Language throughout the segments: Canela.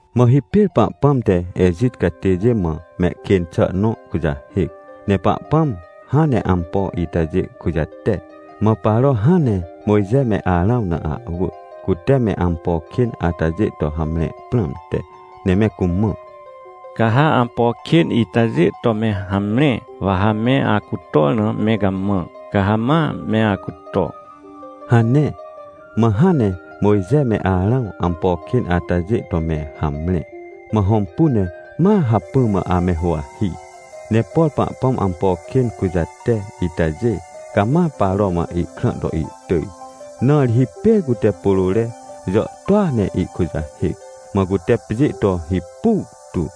Mã hipêr Pahpãm te Ejit catêjê mã mehkên xà nõkujahêc. Ne Pahpãm hãn ne ampo itajê kujate, mãParo hãn ne Mojxe me Arãwna ahwỳ, cute me ampo kên atajê to hamre prãmte, ne me cumã: — Ca ha ampo kên itajê to me hamre, wa ha me acutor na me gamã, ca ha mame acuto — hane. Mã hãn ne Mojxe me Arãw ampo kên atajê to me hamre, mãhõmpune ma hacpỹ mã ame huwahi. Ne por Pahpãm ampo kên kujate itajê, camaParo mã ihkrã to ihtỳj. Na ri hipêr cute pôrôre jàhtôa ne ihkujahêc, mã cutepjê to hipu tu,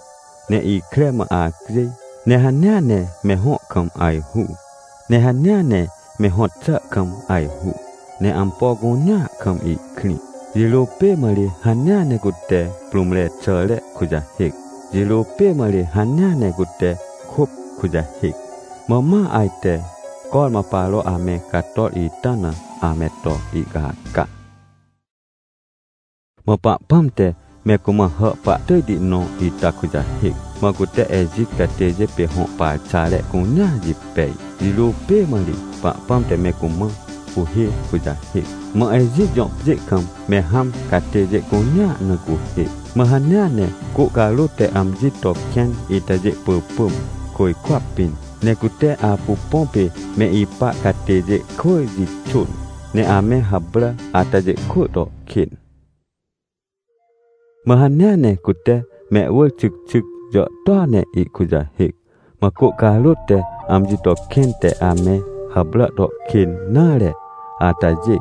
ne ikre mã acjêj, ne hanea ne mehõ kam ajhu, ne hanea ne mehõt xà kam ajhu, ne ampo cunea kam ihkrĩ. Jirô pê mã ri hanea ne cuteprũmre xàre kujahêc, jirô pê mã ri hanea ne cutekôp kujahêc. Mã ma ajte cormã Paro ame cator ita na ame to ihcaca. Mã Pahpãm te me cumã hà pahtỳjti nõita kujahêc, mã cute Ejit catêjê pê hõ parxare cuneajipej. Jirô pê mã ri Pahpãm te me cumã cuhê kujahêc, mã Ejit jõ pjê kam me hãm catêjêcunea na cuhê. Mã hanea ne cô carôt te amjito kẽn itajê pỳpỳm, côjkwa pĩn, necute apu põ pê me ipa catêjê kwỳ jixôn, ne ame hàprà atajê kwỳ to kên. Mã hanea ne cute mehwỳr xycxyc jàhtôa ne ihkujahêc. Mã cô carôt te amji to kẽn te ame hàprà to kên nare atajê,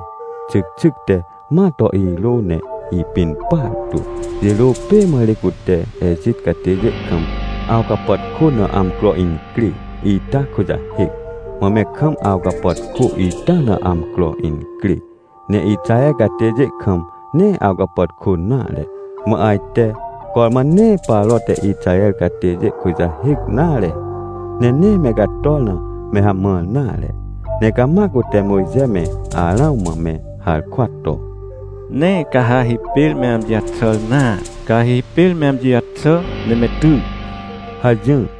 xycxyc te ma to irône ipin partu. Jirô pê mã ri cute Ejit catêjê kam awcapàtkôna amcro incrê ita kujahêc, mã me kam awcapàtkô ita na amcro incrê. Ne Ixaher catêjêkam, nee awcapàtkô nare. Mã ajte cormã nee Paro te Ixaher catêjê kujahêc nare, ne nee me cator na mehamãr nare, ne cama cute Mojxe me Arãw mã me harkwa to: — Nee ca ha hipêr me amji jaxàr nare! Ca ha hipêr me amji jaxà ne me ty! — hajỹr.